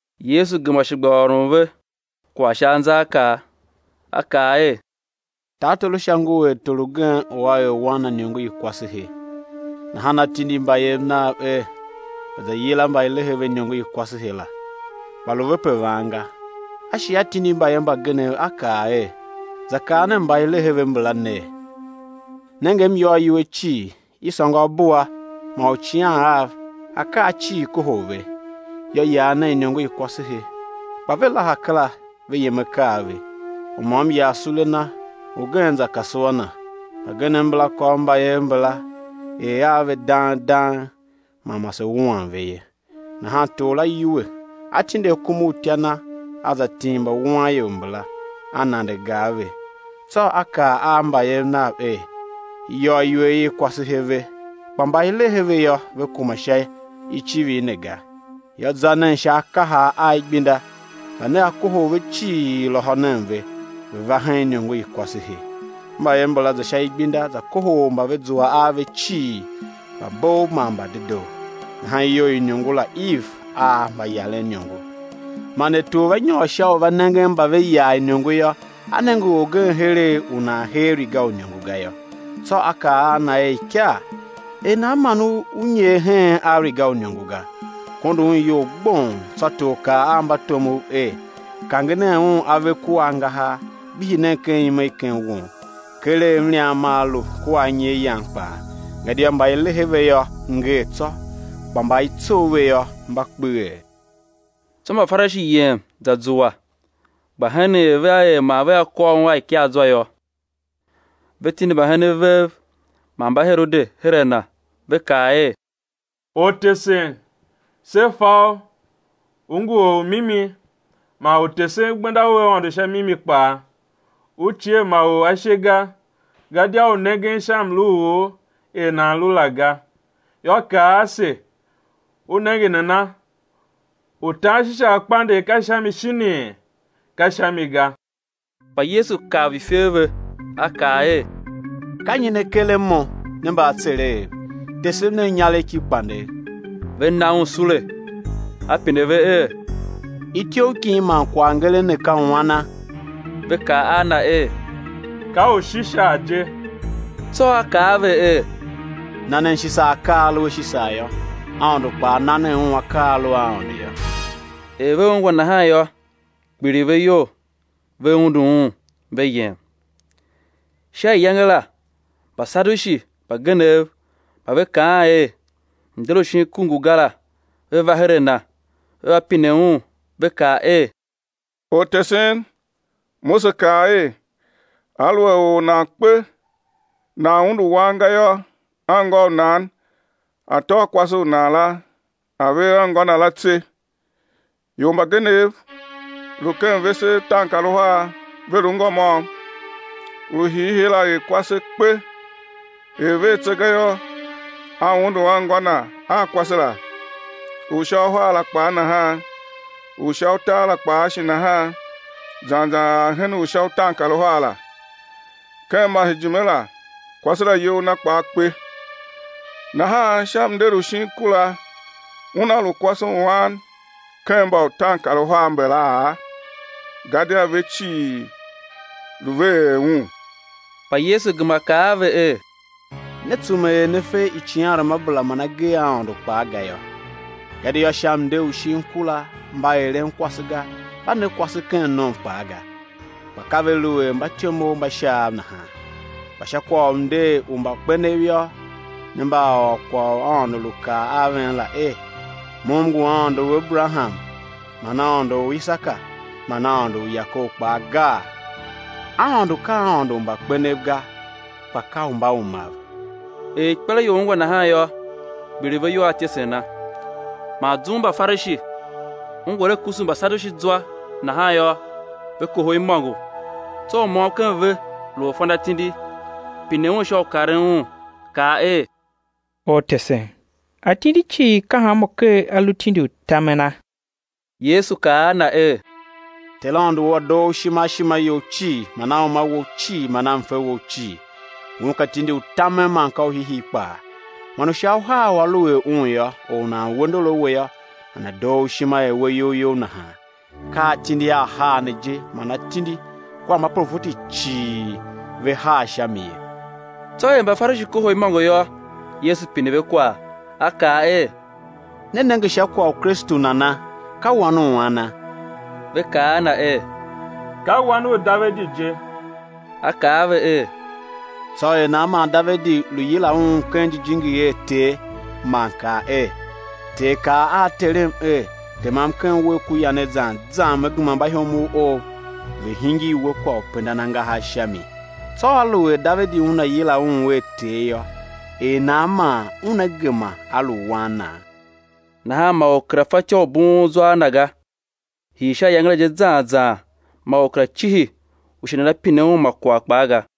Yesu gema shi gba ôron ve kwagh sha anzaakaa, A kaa er: Tartor u Sha ngu er tor ugen u a er wan na iniongo i kwasehe. Nahan a tindi mbayev nav er, ve̱ za yila mba i lehe ve iniongo i kwasehe la, kpa lu ve pe van ga. A shi a tindi mbayev mbagenev, a kaa er: Za kaa nen mba i lehe ve mbala ner: Nenge, m yôr iwer cii, i sôngo abua man uicighan av; akaa cii kohol ve. Yô, yar nen iniongo i kwasehe. Kpa ve laha kera, ve yem akaa ve, u môm yar sule na, ugen za kasua na. Mbagenev mbala kôr mbayev mbala, er a ve dang dang man mase wuan ve ye. Nahan tor la yuwe, a tindi akumautya na a za tim mbawuanior mbala, a nande gar ve. Tsô a kaa a mbayev nav er: I yôr iniongo i kwasehe ve, kpa mba i lehe ve yô, ve kuma sha icivir ne ga. Yô, za nen sha akahar a igbenda, mba nea kohol ve cii, lôhô nen ve, ve̱ va hen iniongo i kwasehe. Mbayev mbala za sha igbenda za kohol mba ve zua a ve cii, mbabov man mbadedoo, nahan iyou i iniongo la iv a mbayaren iniongo. Man er tor va nyôr sha u va nengen mba ve yar iniongo yô, a nenge orgen heregh u nan hee riga u iniongo ga yô. Tsô a kaa a na er: Ikar, er nan man u nyer heen a riga u iniongo ga? Kondo un iyol gbong. Tsô tor kaa a mbatomov er: Kange nen un ave kua angahar, gbihi nen ken ime i ken won. Keregh mliam maa lu kua anyi a yan kpaa. Gadia mba i lehe ve yô, ngee tsô, kpa mba i tsough ve yô, mba kpeghee. Tsô Mbafarishi yem, za zua, gba henen er vea er man vea kôr Un a ikaazwa yô. Ve tindi mbahenen vev man Mbaherode her a Na, ve kaa er: Ortesen, se fa U ngu Or u mimi, man U tesen gbenda u Aôndo sha mimi kpaa; U cie ma or ashe ga, gadia U nengen sha mlu u or er nan lu la ga. Yô, kaa ase, U nenge nana, u tan Shisar kpandegh ka sha mi shinii, ka sha mi ga? Kpa Yesu kav ifer ve, A kaa er: Ka nyi ne karen Mo, ne mbaatsereghev? Tesem nen inyaregh ki kpandegh. Ve na Un sule. A pine ve er: Ityough kin man kwaghngeren ne ka u ana? Ve kaa a Na er: Ka u Shisar je. Tsô A kaa a ve er: Na nen Shisar akaa a a lu a Shisar yô, Aôndo kpaa na nen Un akaa a a lu a Aôndo yô. Er ve ungwa nahan yô, kpiligh ve iyol, ve undu Un, ve yem. Sha iyange la Mbasadushi mbagenev mba ve kaan er, mnder u shin ku ngu ga la, ve va her a Na, ve va pine Un, ve kaa er: Ortesen, Mose kaa er: Aluer or nan kpe, nan undu wan ga yô, anngô u nan a̱ tôô kwase u nan la a̱ ver anngô na la tse. Ior mbagenev lu ken vese utaankaruhar, ve lu ngô môm. U hiihii la er kwase, kpe; er ver tse ga yô, a undu anngô na a kwase la. U sha uhar la kpaa nahan; u sha utar kpaa shi nahan; zan zan ar hen u sha utaankaruhar la. Ken masejime la, kwase la iyol na kpaa kpe. Nahan sha mnder u shin ku la, una lu kwase u an ken mba utaankaruhar mbala? Gadia ve cii lu ve er un. Kpa Yesu gema kaa a ve er: Ne tsume er ne fe icighanruamabera man agee a Aôndo kpaa ga yô. Gadia sha mnder u shin ku la mba eren kwase ga, mba ne kwase ken nom kpaa ga; kpa ka ve lu er mbatyomov mba Shaav nahan. Kpa sha kwagh u mnder u mbakpenev yô, ne mba a ôr kwagh u Aôndo lu kaa a ven la er: Mo M ngu Aôndo u Aberaham man Aôndo u Isaka man Aôndo u Yakob kpaa, gaa? Aôndo ka Aôndo u mbakpenev ga, kpa ka u mbaumav. Er ikpelaior ungwa nahan yô, kpiligh ve iyol a ityesen Na. Man zum u Mbafarishi ungwa er A kusu Mbasadushi zwa nahan yô, ve kohol imôngo. Tsô u môm ken ve, lu orfanatindi, pine Un sha u karen Un, kaa er: Ortesen, atindi cii ka hanmô ker a lu tindi u tamena? Yesu kaa a na er: Ter Aôndo wou A̱ doo u ishima a ishima you cii man a uma wou cii man a mfe wou cii. Ngun ka tindi u tamen man ka u hiihii kpaa. Man u sha uhar u a lu er un yô, or u nan we ndor a we yô, nana̱ doo u ishima er we iyol you nahan. Ka atindi ahar ne je man atindi kua mbaprofeti cii ve har sha mi ye. Tsô er Mbafarishi kohol imôngo yô, Yesu pine ve kwagh, A kaa er: Ne nenge sha kwagh u Kristu nana? Ka Wan u ana? Ve kaa a Na er: Ka Wan u Davidi je. A kaa a ve er: Tsô er nan man Davidi lu yila Un ken jijingi er Ter, man kaa er: Ter kaa a Terem er: Temam ken uwegh ku yanegh zan zan Me gema mbaihomov Ou ve̱ hingir We kwagh u pendan angahar sha mi? Tsô aluer Davidi una yila Un er, Ter yô, er nan man Una gema A lu Wan na? Nahan ma or kera fatyô u bughun zwa a Na ga; hii sha iyange la je zan zan ma or kera cihi u shi nana pine Un ma kwagh kpaa ga.